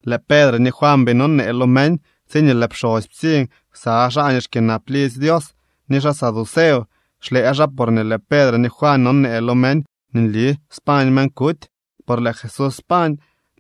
Lëë Pedre ni Juan bii nonee lo meñ, tsiñee lëë pxosy ptsiñ ksa xaa nii xkyënap lidzy Dios ni xaa saduceo. Xlëë xaa porñee lëë Pedre ni Juan nonee lo meñ nii nli spañ meñ kuty, por lëë Jesús pañ.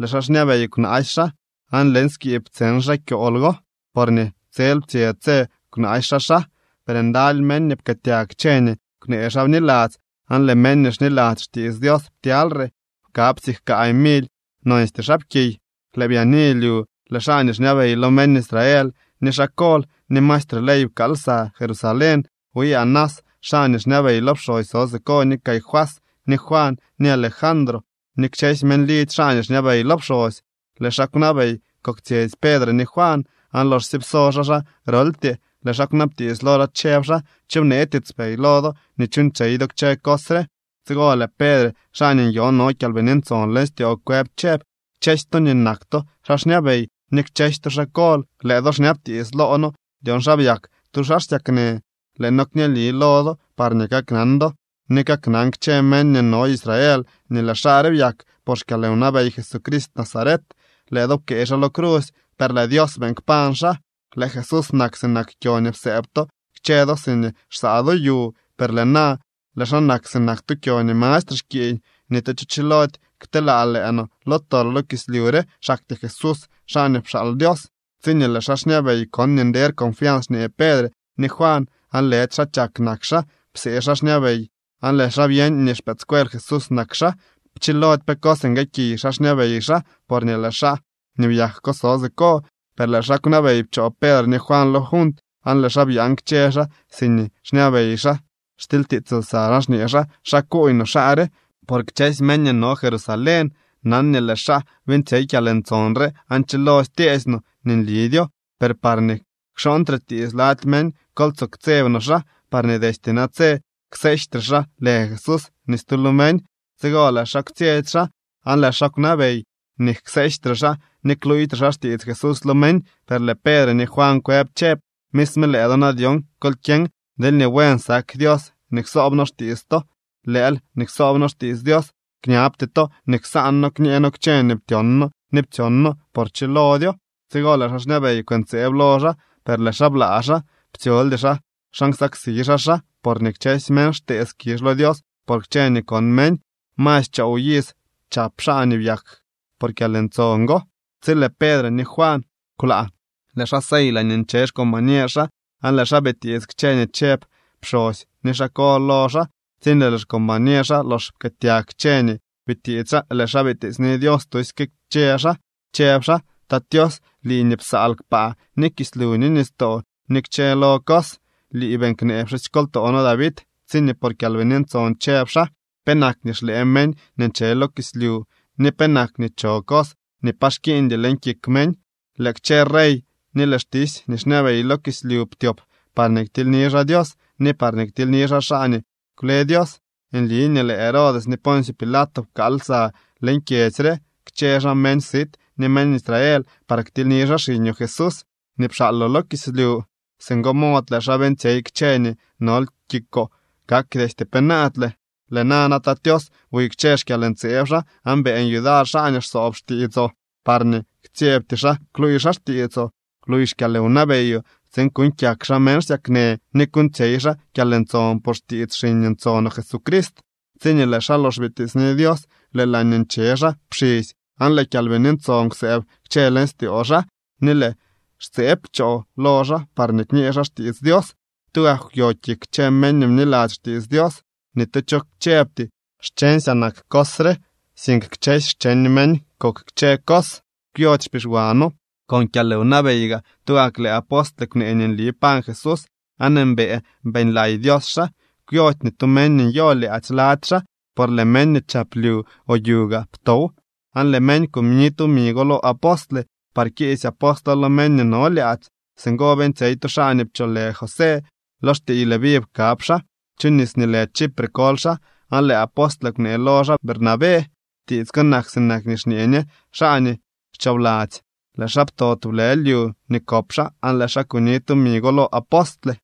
Lëë xaa xñabey kwnaasy xaa aan leñ skiib ptseñ xaa kyool go, porñee tsel ptsye tse kwnaasy xaa xaa. Per ndaly meñ nii pkëëtyag kchë nii kwnee xaa bniladzy, aan lëë meñ nii xniladzy xtiits Dios ptyalyre. Pkab siik kaay mily nonstyee xaapkiy. Lëë byaani lyu lëë xaa nii xñabey lo meñ Israel, ni xaa kol, ni maestre ley pkaal lsa Jerusalén. Wi Anás, xaa nii xñabey lo pxosy so siko, ni Caifás, ni Juan, ni Alejandro ni kchësy meñ lidzy xaa nii xñabey lo pxosy. Lëë xaa kwnabey koktsyetsy Pedre ni Juan, aan loxsye pso xaa xaa groltyee, lëë xaa kwnabtiits lo xaa, chëb xaa: —¿Cho bnee tiitspey lo do nii chuuñtsyey do kchë cos re? Tsigo lëë Pedre, xaa nii nyoo no Kyalbini Ntson leñ styoo kwëb chëb: —Kchësy to nii nak to xaa xñabey ni kchësy to xaa kol, lëë do xñabtiits loo noo dyon xa byak tu xaa xsyaknë. Lëë noo kñeeli lo do parñee kaknan do ni kaknan kchë meñ nii no Israel nii lëë xaa re byak por xkyalwnabey Jesucrist Nazaret. Lëë do pkëë xaa lo crusy, per lëë Dios beeñ kpañ xaa. Lëë Jesús nak sinak kyo nii psëëb to kchë do siñee xsaa do yu, per lëë na lëë xaa nak sinak tu kyo nii mastre xkiiñ. Ni tu cho chilody kteelaa lëë no lo tol lo kislyu re, xaktyee Jesús, xaa nii pxaal Dios. Tsiñee lëë xaa xñabey kon nii nder confians xñee Pedre ni Juan, aan lëdy xaa chak nak xaa, psee xaa xñabey aan lëë xaa byeñ nii xpëëdscuel Jesús nak xaa. Pchilody pe cos nguëëkiy xaa xñabey xaa, porñee lëë xaa nii byak so siko. Per lëë xaa kwnabey pchoo Pedre ni Juan lo junt aan lëë xaa byaan kchë xaa siñee xñabey xaa, xtilytiits lsa xaa, xñee xaa: —¿Xa kuuñ no xaa re? Por kchësy meñ nii no Jerusalén nan nii lëë xaa beeñtsyey kyalntson re, aan chilody tyeesy no nii nlidyo. Per parñee kxooñtre tiits lady meñ, kol tsoo ktseb no xaa, parñee destye natse kseejtre xaa lë Jesús ni stu lo meñ. Tsigo lëë xaa kwtsyetsy xaa, aan lëë xaa kwnabey nii kseejtre xaa ni kluuytre xaa xtiits Jesús lo meñ. Per lëë Pedre ni Juan kwëb chëb: —Misme lëë do na dyon kol kyeñ deelñee buen sak Dios nii ksoob noo xtiits to, lëël nii ksoob noo xtiits Dios. Kñabty to nii ksaan noo kñee noo kchë nii ptyon noo ni ptsyon noo, por chilodyo. Tsigo lëë xaa xñabey kwëntseeb lo xaa, per lëë xaa blaa xaa. Ptsyoldy xaa xa nsaksi xaa xaa, porñee kchësy meñ xtee skizh lo Dios por kchë nii kon meñ. Masy choow iz chap xaa nii byak por kyalntson go. Tsi lëë Pedre ni Juan kwlaa, lëë xaa sey laañee nche xcombañer xaa aan lëë xaa bitiits kchë nii chëb pxosy ni xaa kol lo xaa. Tsiñee lëë xcombañer xaa lox pkëëtyag kchë nii bitiits xaa, lëë xaa bitiitsni Dios tusyke kchë xaa, chëb xaa: —Tat Tios, lii nii psaal kpaa ni kislyu ni nistoo ni kchë lo cos, lii beeñ knee pxusykoltoo noo David, tsiñee por Kyalbini Ntson chëb xaa: ¿Penak nii xlëë meñ nii nche lo kislyu, ni penak nii cho cos nii pa xkiiñdy leñ kik meñ? Lëë kchë rey ni lëë xtisy nii xñabey lo kislyu ptyop parñee ktilyni xaa Dios ni parñee ktilyni xaa xaa nii kwle Dios. ’Nli nii lëë Herodes ni Poncio Pilato pkaal lsa leñ kyedzy re kchë xaa meñ sit ni meñ Israel par ktilyni xaa xiñoo Jesús nii pxaaloo lo kislyu. Singo mod lëë xaa beeñtsyey kchë nii nol kikoo kak destye penaadle. Lëë nana, Tat Tios, buy kchë xkyalntseeb xaa, aan beeñ yudar xaa nii xsoob xtiitsoo parñee ktsyebty xaa kluuy xaa xtiitsoo. Bluuy xkyalwnabeyoo tsiin kuuñ kyak xaa meñ xsyaknë ni kuuñtsyey xaa kyalntson por xtiits xiñ ntsonoo Jesucrist. Tsiñee lëë xaa lox bitiitsni Dios, lëë laañee nche xaa pxisy, aan lëë Kyalbini Ntson kwsëëb kchë leñ styoo xaa, ni lëë xtseeb pchoo lo xaa parñee kñee xaa xtiits Dios. Tugak kwyo kik kchë meñ nii bniladzy xtiits Dios. Ni tu cho chëbty: “Xcheñsyaa nak cos re”, sink kchësy xcheñ meñ kok kchë cos, kwyody xpixwano. Con kyalwnabey gaa tugak lëë apostle kwnee nii nli pañ Jesús aan mbëë beeñlay Dios xaa. Kwyody ni tu meñ nii nyo lyaadzy lady xaa, por lëë meñ nii chap lyu o yu gaa ptow aan lëë meñ kuni tumi go lo apostle par kiisy apostlo lo meñ nii no lyaadzy. Singo beeñtsyey tu xaa nii pcholë José. Lo xtiiy Leví pkab xaa, chu nis nii lë Chipre koly xaa. Aan lëë apostle kwnee lo xaa Bernabé. (Tiits ko nak sinak nii xñee ñe: Xaa nii xchoobladzy.) Lëë xaa pto tublë lyu nii kop xaa aan lëë xaa kuni tumi go lo apostle.